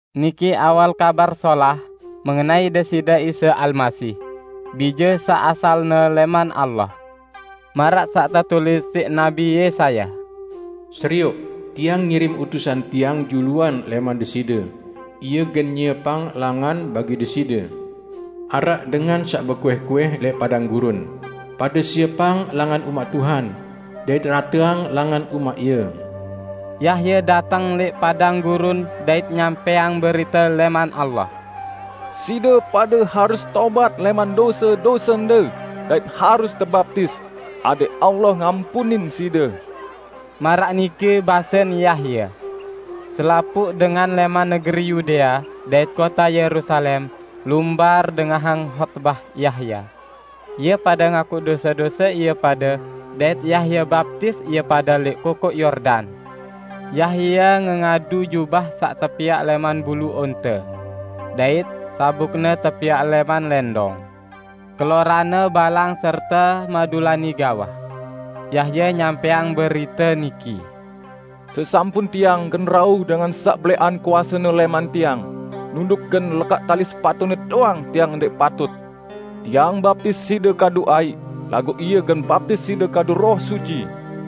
Niki awal Kabar Solah mengenai Deside Isa Almasih, Bije saq asalne lẽman Allah. Maraq saq tetulis siq Nabi Yesaya: " 'Serioq, Tiang ngirim utusan Tiang juluan lẽman Deside, ie gen nyiepang langan bagi Deside.' Araq dengan saq bekuih-kuih lẽq padang gurun, 'Pade siepang langan umaq Tuhan; dait rateang langan umaq Ie.' " Yahya dateng lẽq padang gurun dait nyampẽang berite lẽman Allah. "Side pade harus tobat lẽman dose-dosende dait harus tebaptis, adẽq Allah ngampunin side," maraq nike basen Yahya. Selapuq dengan lẽman negeri Yudea dait kote Yerusalem lumbar dengahang hotbah Yahya. Ie pade ngaku dose-dose ie pade dait Yahya baptis ie pade lẽq Kokoq Yordan. Yahya ngengadu jubah saq tepiaq lẽman bulu onte, dait sabukne tepiaq lẽman lẽndong. Keloranne balang serte madulani gawah. Yahya nyampẽang berite niki, "Sesampun tiang, gen rauh Dengan saq belẽqan kuase-Ne lẽman tiang, nunduk gen lekaq tali sepatu-Ne doang tiang ndẽq patut. Tiang baptis side kadu aiq, laguq Ie gen baptis side kadu Roh Suci."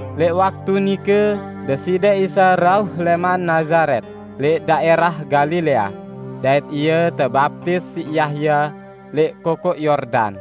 Lẽq waktu nike, Deside Isa rauh lẽman Nazaret lẽq daẽrah Galilea, dait Ie tebaptis siq Yahya lẽq Kokoq Yordan.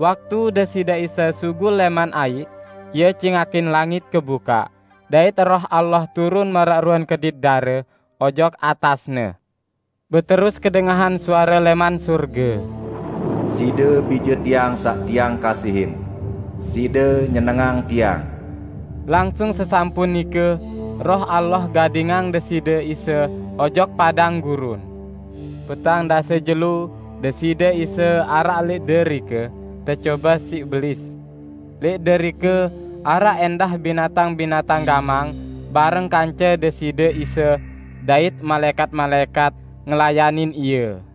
Waktu Deside Isa sugul lẽman aiq, Ie cingakin langit kebukaq, dait Roh Allah turun maraq ruen kedit dare ojok atas-Ne. Beterus kedengahan suare lẽman sorge: "Side Bije Tiang saq Tiang kasihin. Side nyenengang Tiang." Langsung sesampun nike, Roh Allah gadingang Deside Isa ojok padang gurun. Petang dase jelo Deside Isa araq lẽq derike tecobe siq Belis. Lẽq derike araq ẽndah binatang-binatang gamang bareng kance Deside Isa, dait malaẽkat-malaẽkat ngelayanin Ie.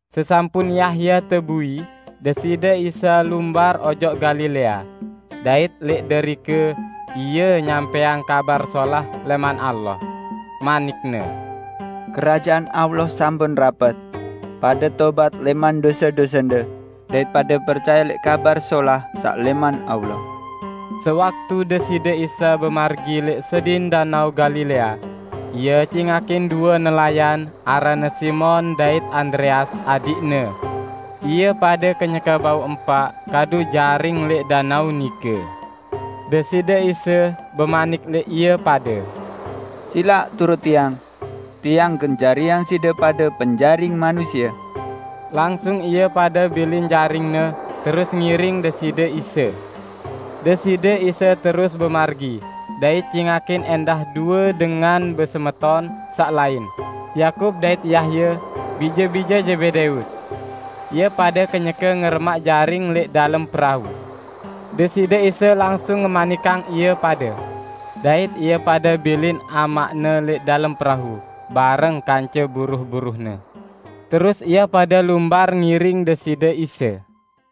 Sesampun Yahya tebui, Deside Isa lumbar ojok Galilea, dait lẽq derike Ie nyampẽang Kabar Solah lẽman Allah. Manik-Ne, "Kerajaan Allah sampun rapet. Pade tobat lẽman dose-dosende, dait pade percaye lẽq Kabar Solah saq lẽman Allah!" Sewaktu Deside Isa bemargi lẽq sedin Danao Galilea, Ie cingakin due nelayan aranne Simon dait Andreas adiqne. Ie pade kenyeke bau empaq kadu jaring lẽq danao nike. Deside Isa bemanik lẽq ie pade, "Silaq turut Tiang. Tiang gen jariang side pade penjaring manusie." Langsung ie pade bilin jaringne terus ngiring Deside Isa. Deside Isa terus bemargi, dait cingakin ẽndah due dengan besemeton saq lain, Yakub dait Yahya, bije-bije Zebedeus. Ie pade kenyeke ngeremaq jaring lẽq dalem perau. Deside Isa langsung ngemanikang ie pade. Dait ie pade bilin amaqne lẽq dalem perau bareng kance buruh-buruhne. Terus ie pade lumbar ngiring Deside Isa.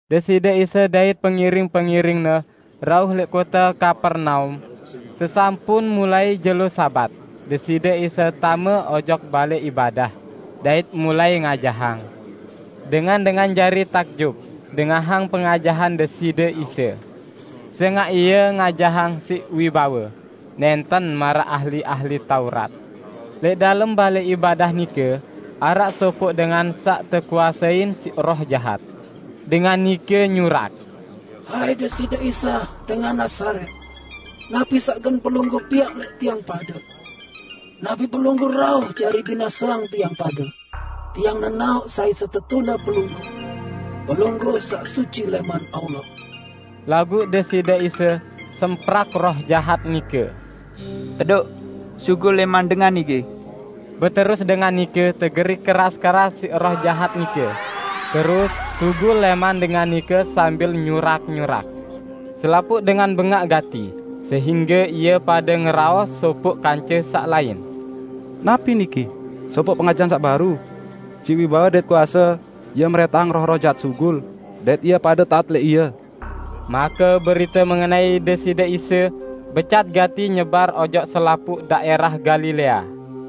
Deside Isa dait pengiring-pengiring-Ne rauh lẽq kote Kapernaum. Sesampun mulai jelo Sabat, Deside Isa tame ojok balẽ ibadah, dait mulai ngajahang. Dengan-dengan jari takjub dengahang pengajahan Deside Isa. Sẽngaq Ie ngajahang siq wibawe, nẽnten maraq ahli-ahli Taurat. Lẽq dalem balẽ ibadah nike araq sopoq dengan saq tekuasein siq roh jahat. Dengan nike nyurak: "Hai Deside Isa dengan Nazaret, napi saq gen Pelungguh piaq lẽq tiang pade? Napi Pelungguh rauh jari binaseang tiang pade? Tiang nenaoq sai setetune Pelungguh: Pelungguh saq Suci lẽman Allah!" Laguq Deside Isa semprak roh jahat nike, "Tedoq, sugul lẽman dengan niki!" Beterus dengan nike tegerik keras-keras siq roh jahat nike, terus sugul lẽman dengan nike sambil nyurak-nyurak. Selapuq dengan bengaq gati, sehingge ie pade ngeraos sopoq kance saq lain, "Napi niki? Sopoq pengajahan saq baru! Siq wibawe dait kuase, Ie mrẽntahang roh-roh jahat sugul, dait ie pade taat lẽq Ie!" Make berite mengenai Deside Isa becat gati nyebar ojok selapuq daẽrah Galilea.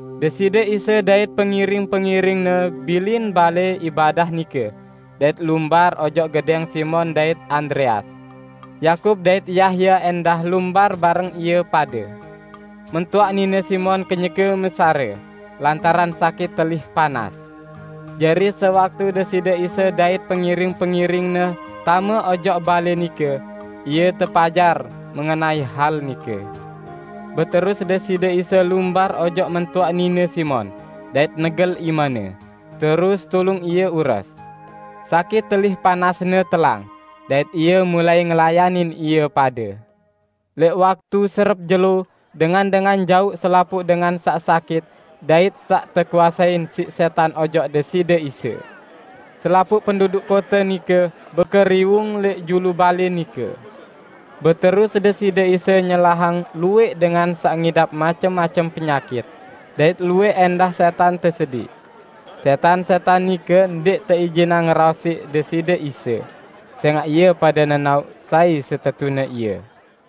Deside Isa dait pengiring-pengiring-Ne bilin balẽ ibadah nike dait lumbar ojok gedẽng Simon dait Andreas. Yakub dait Yahya ẽndah lumbar bareng ie pade. Mentoaq nine Simon kenyeke mesarẽ lantaran sakit telih panas. Jari sewaktu Deside Isa dait pengiring-pengiring-Ne tame ojok balẽ nike, Ie tepajar mengenai hal nike. Beterus Deside Isa lumbar ojok mentoaq nine Simon, dait negel imene, terus tulung ie ures. Sakit telih panasne telang, dait ie mulai ngelayanin ie pade. Lẽq waktu serep jelo, dengan-dengan jauq selapuq dengan saq sakit dait saq tekuasein siq sẽtan ojok Deside Isa. Selapuq penduduk kote nike bekeriwung lẽq julu balẽ nike. Beterus Deside Isa nyelahang luwẽq dengan saq ngidap macem-macem penyakit, dait luwẽq ẽndah sẽtan tesediq. Sẽtan-sẽtan nike ndẽq teijinang ngeraos siq Deside Isa, sẽngaq ie pade nenaoq sai setetune Ie.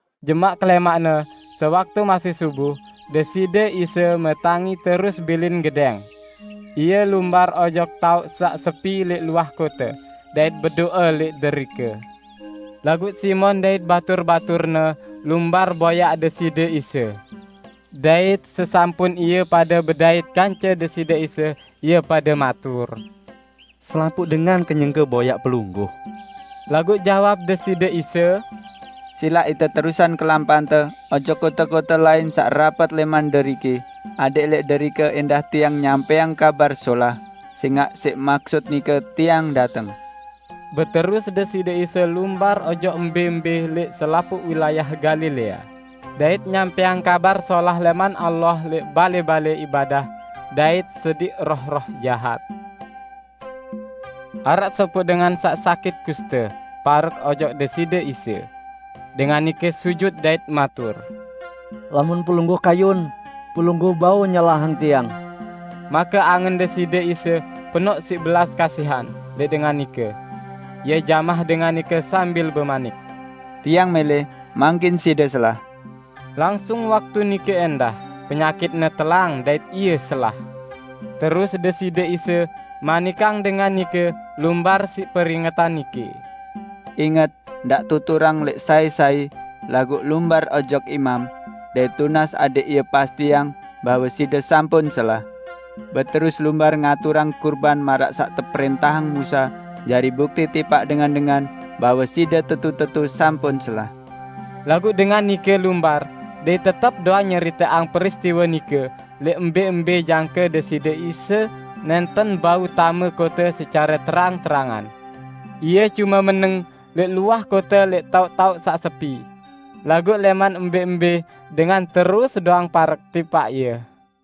Jemaq kelẽmaqne, sewaktu masih subuh, Deside Isa metangi terus bilin gedẽng. Ie lumbar ojok taoq saq sepi lẽq luah kote, dait bedo'e lẽq derike. Laguq Simon dait batur-baturne lumbar boyaq Deside Isa. Dait sesampun ie pade bedait kance Deside Isa, ie pade matur, "Selapuq dengan kenyeke boyaq Pelungguh." Laguq jawab Deside Isa, "Silaq ite terusang kelampante ojok kote-kote lain saq rapet lẽman deriki, adẽq lẽq derike ẽndah Tiang nyampẽang Kabar Solah, sẽngaq siq maksut nike Tiang dateng." Beterus Deside Isa lumbar ojok mbẽ-mbẽ lẽq selapuq wilayah Galilea, dait nyampẽang Kabar Solah lẽman Allah lẽq balẽ-balẽ ibadah dait sediq roh-roh jahat. Araq sopoq dengan saq sakit kuste parek ojok Deside Isa. Dengan nike sujut dait matur, "Lamun Pelungguh kayun, Pelungguh bau nyelahang tiang." Make angen Deside Isa penoq siq belas kasihan lẽq dengan nike. Ie jamah dengan nike sambil bemanik, "Tiang mẽlẽ, mangkin side selah!" Langsung waktu nike ẽndah, penyakitne telang dait ie selah. Terus Deside Isa manikang dengan nike lumbar siq peringetan niki, "Inget, ndaq tuturang lẽq sai-sai, laguq lumbar ojok imam, dait tunas adẽq ie pastiang bahwe side sampun selah. Beterus lumbar ngaturang kurban maraq saq teprẽntahang Musa jari bukti tipaq dengan-dengan bahwe side tetu-tetu sampun selah." Laguq dengan nike lumbar, dait tetep doang nyeriteang peristiwe nike lẽq mbẽ-mbẽ jangke Deside Isa nẽnten bau tame kote secare terang-terangan. Ie cume meneng lẽq luah kote lẽq taoq-taoq saq sepi. Laguq lẽman mbẽ-mbẽ dengan terus doang parek tipaq Ie.